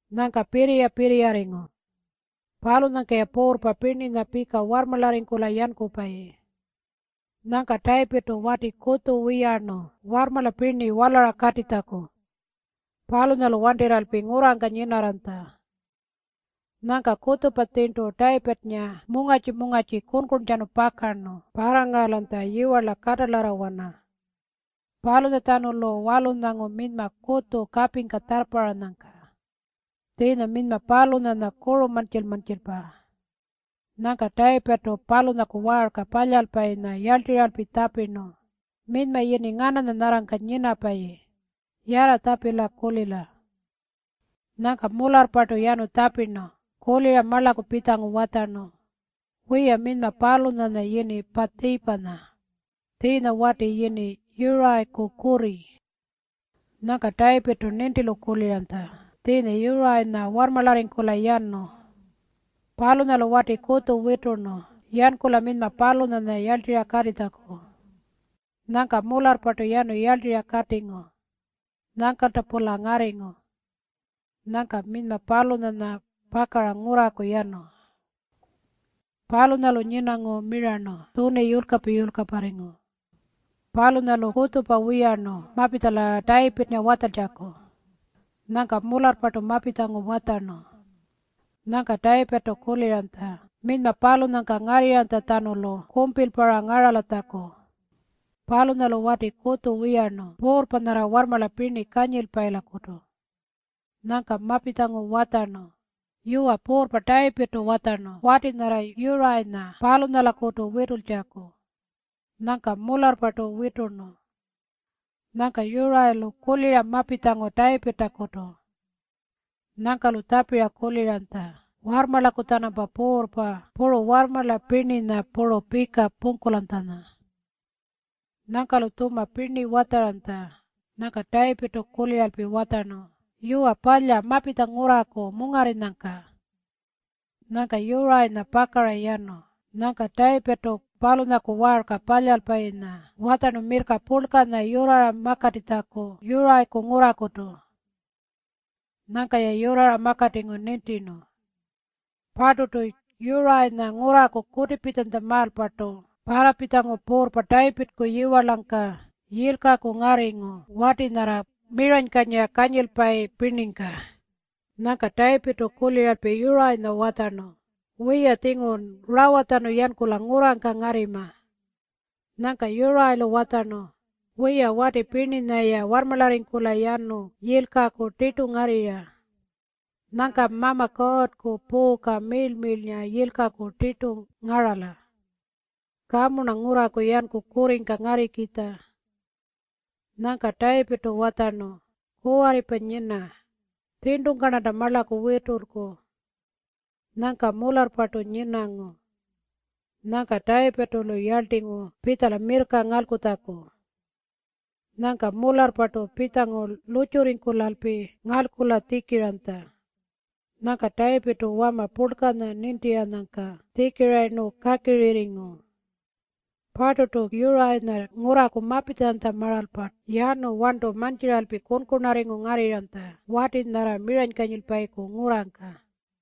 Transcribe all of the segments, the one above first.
Nyangka pirriya-pirriyarringu. Palunyangka-ya puurrpa pirninya warrmarlarringkula yankupayi. Nyangka Tayipirrtu wati kutju wiyarnu warrmarla pirni walara katitjaku. Palunyalu wantirralpi ngurrangka nyinarranytja. Nyangka kutjupa tjirntu Tayipirrnga mungarrtji-mungarrtji kunkuntjanu pakarnu parrangaralanytja yiwarla katalarrawana. Palunyatjanulu walunyangu minyma kutju kapingka tjarrparranyangka. Tjiinya minyma palunyanya kuru mantjil-mantjilpa. Nyangka Tayipirrtu palunyaku waarka palyalpayinya yarltirralpi tjapirnu, “Minyma yini ngananya nyarrangka nyinapayi? Yarra tjapila.” Nyangka mularrpartu yanu tjapira marlaku pitjangu watjarnu, “Wiya, minyma palunyanya yini Paatjipanya. Tjiinya wati yini Yurayiku kurri.” Nyangka Tayipirrtu nintilu kuliranytja tjiinya Yurayinya warrmarlarringkula yanu. Palunyalu wati kutju witurnu yankula minyma palunyanya yarltirra katitjaku. Nyangka mularrpartu yanu yarltirra katingu. Nyangkalta-pula ngarringu. Nyangka minyma palunyanya pakara ngurraku yanu. Palunyalu nyinangu mirarnu tjuni yulkapa-yulkaparringu. Palunyalu kutjupa wiyarnu mapitjala Tayipirrnga watjaltjaku. Nyangka mularrpartu mapitjangu watjarnu. Nyangka Tayipirrtu kuliranytja minyma palunyangka ngarrinytjatjanulu kumpilpa-ra ngaralatjaku. Palunyalu wati kutju wiyarnu puurrpa nyarra warrmarla pirni kanyilpayilakutu. Nyangka mapitjangu watjarnu, “Yuwa, Puurrpa Tayipirrtu watjarnu wati nyarra Yurayinya palunyalakutu witultjaku.” Nyangka mularrpartu witurnu. Nyangka Yurayilu kulira mapitjangu Tayipirrtakutu. Nyangka-lu tjapiranytja warrmarlaku-tjanampa puurrpa puru warrmarla pirninya puru pika pungkulanytjanya. Nyangka-lu tjuma pirni watjaranytja. Nyangka Tayipirrtu kuliralpi watjarnu, “Yuwa palya, mapitja ngurraku mungarrinyangka.” Nyangka Yurayinya pakara yanu. Nyangka Tayipirrtu palunyaku waarka palyalpayinya watjarnu mirrka purlkanya yurrara makatitjaku Yurayiku ngurrakutu. Nyangka-ya yurrara makatingu nintirnu. Parturtu Yurayinya ngurraku kutipitjanytjamaalpartu parrapitjangu puurrpa Tayipirrku yiwarlangka yilkaku ngarringu wati nyarra miranykanyira kanyilpayi pirningka. Nyangka Tayipirrtu kuliralpi Yurayinya watjarnu, “Wiya, tjingurun rawatjanu yankula ngurrangka ngarrima.” Nyangka Yurayilu watjarnu, “Wiya, wati pirninya-ya warrmarlarringkula yanu yilkaku tirtu ngarrirra. Nyangka Mama Kuurrku puuka miirl-miirlnga yilkaku tirtu ngarala. Kamu-rna ngurraku yanku kurringka ngarrikitja.” Nyangka Tayipirrtu watjarnu, “Kuwarripa nyina. Tjirntungka-rnanta marlaku witulku.” Nyangka mularrpartu nyinangu. Nyangka Tayipirrtu-lu yarltingu pitjala mirrka ngalkutjaku. Nyangka mularrpartu pitjangu lurrtjurringkulalpi ngalkula tjikiranytja. Nyangka Tayipirrtu wama purlkanya nintiranyangka tjikirayirnu kakirirringu. Parturtu Yurayinya ngurraku mapitjanytjamaalpa yanu warntu mantjiralpi kunkunarringu ngarrirranytja wati nyarra miranykanyilpayiku ngurrangka.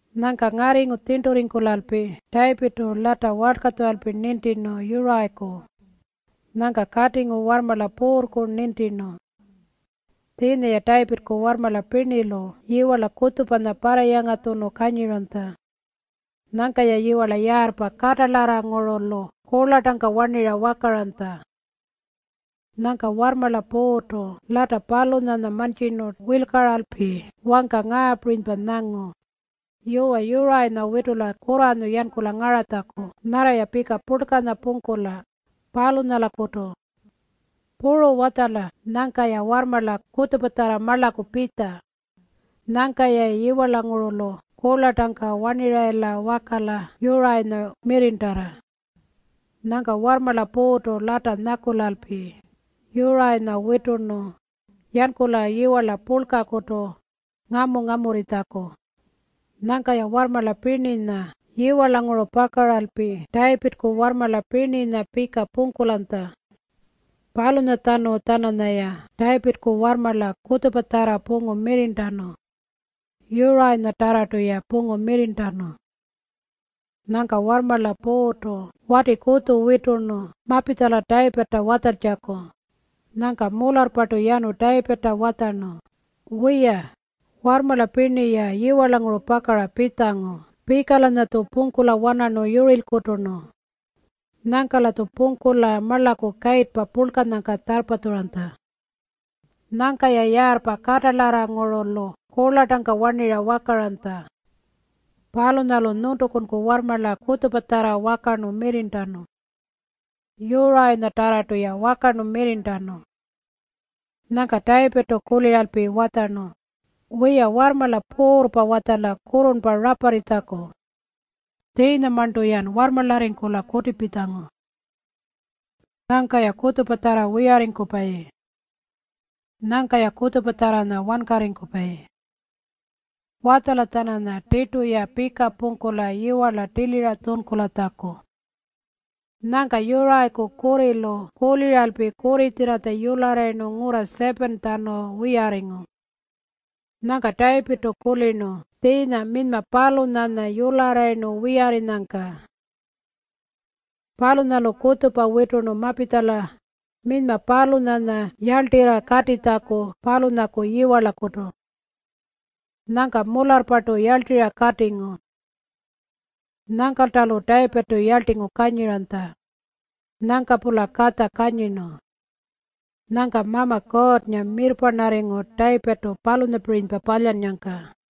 Nyangka ngarringu tjirnturringkulalpi Tayipirrtu lata walkatjuralpi nintirnu Yurayiku. Nyangka katingu warrmarla puurrku nintirnu. Tjiinya-ya Tayipirrku warrmarla pirnilu yiwarla kutjupanya parrayangatjunu kanyiranytja. Nyangka-ya yiwarla yaarrpa katalarrangurulu kurlartangka warnirra wakaranytja. Nyangka warrmarla puurrtu lata palunyanya mantjirnu wirlkaralpi wangka ngaapirinypa nyangu, “Yuwa, Yurayinya witula kurranyu yankula ngaratjaku nyarra-ya pika purlkanya pungkula, palunyalakutu. Puru watjala nyangka-ya warrmarla kutjupatjarra marlaku pitja. Nyangka-yayi yiwarlangurulu kurlartangka warnirrayila wakala Yurayinya mirrirntala.” Nyangka warrmarla puurrtu lata nyakulalpi Yurayinya witurnu yankula yiwarla purlkakutu ngamu-ngamurritjaku. Nyangka-ya warrmarla pirninya yiwarlanguru pakaralpi Tayipirrku warrmarla pirninya pika pungkulanytja. Palunyatjanu-tjananyaya Tayipirrku warrmarla kutjupatjarra pungu mirrirntanu. Yurayinyatarrartu-ya pungu mirrirntanu. Nyangka warrmarla puurrtu wati kutju witurnu mapitjala Tayipirrta watjaltjaku. Nyangka mularrpartu yanu Tayipirrta watjarnu, “Wiya, warrmarla pirni-ya yiwarlanguru pakara pitjangu pika-lanyatju pungkula wanarnu yurirlkuturnu. Nyangka-latju pungkula marlaku kayirrpa purlkanyangka tjarrpatjuranytja. Nyangka-ya yaarrpa katalarrangurulu kurlartangka warnirra wakaranytja. Palunyalu nyuntukunku warrmarla kutjupatjarra wakarnu mirrirntanu. Yurayinyatarrartu-ya wakarnu mirrirntanu.” Nyangka Tayipirrtu kuliralpi watjarnu, “Wiya, warrmarla puurrpa watjala kurrurnpa raparritjaku. Tjiinyamarntu-yan warrmarlarringkula kutipitjangu. Nyangka-ya kutjupatjarra wiyarringkupayi. Nyangka-ya kutjupatjarranya wankarringkupayi. Watjala-tjananya tirtu-ya pika pungkula yiwarla tilira tjunkulatjaku.” Nyangka Yurayiku kurrilu kuliralpi kurritjirratja yularrayirnu ngurra 7-tjanu wiyarringu. Nyangka Tayipirrtu kulirnu tjiinya minyma palunyanya yularrayirnu wiyarrinyangka. Palunyalu kutjupa witurnu mapitjala minyma palunyanya yarltirra katitjaku palunyaku yiwarlakutu. Nyangka mularrpartu yarltirra katingu. Nyangkalta-lu Tayipirrtu yarltingu kanyiranytja. Nyangka-pula katja kanyirnu. Nyangka Mama Kuurrnga mirrparnarringu Tayipirrtu palunyapirinypa palyannyangka.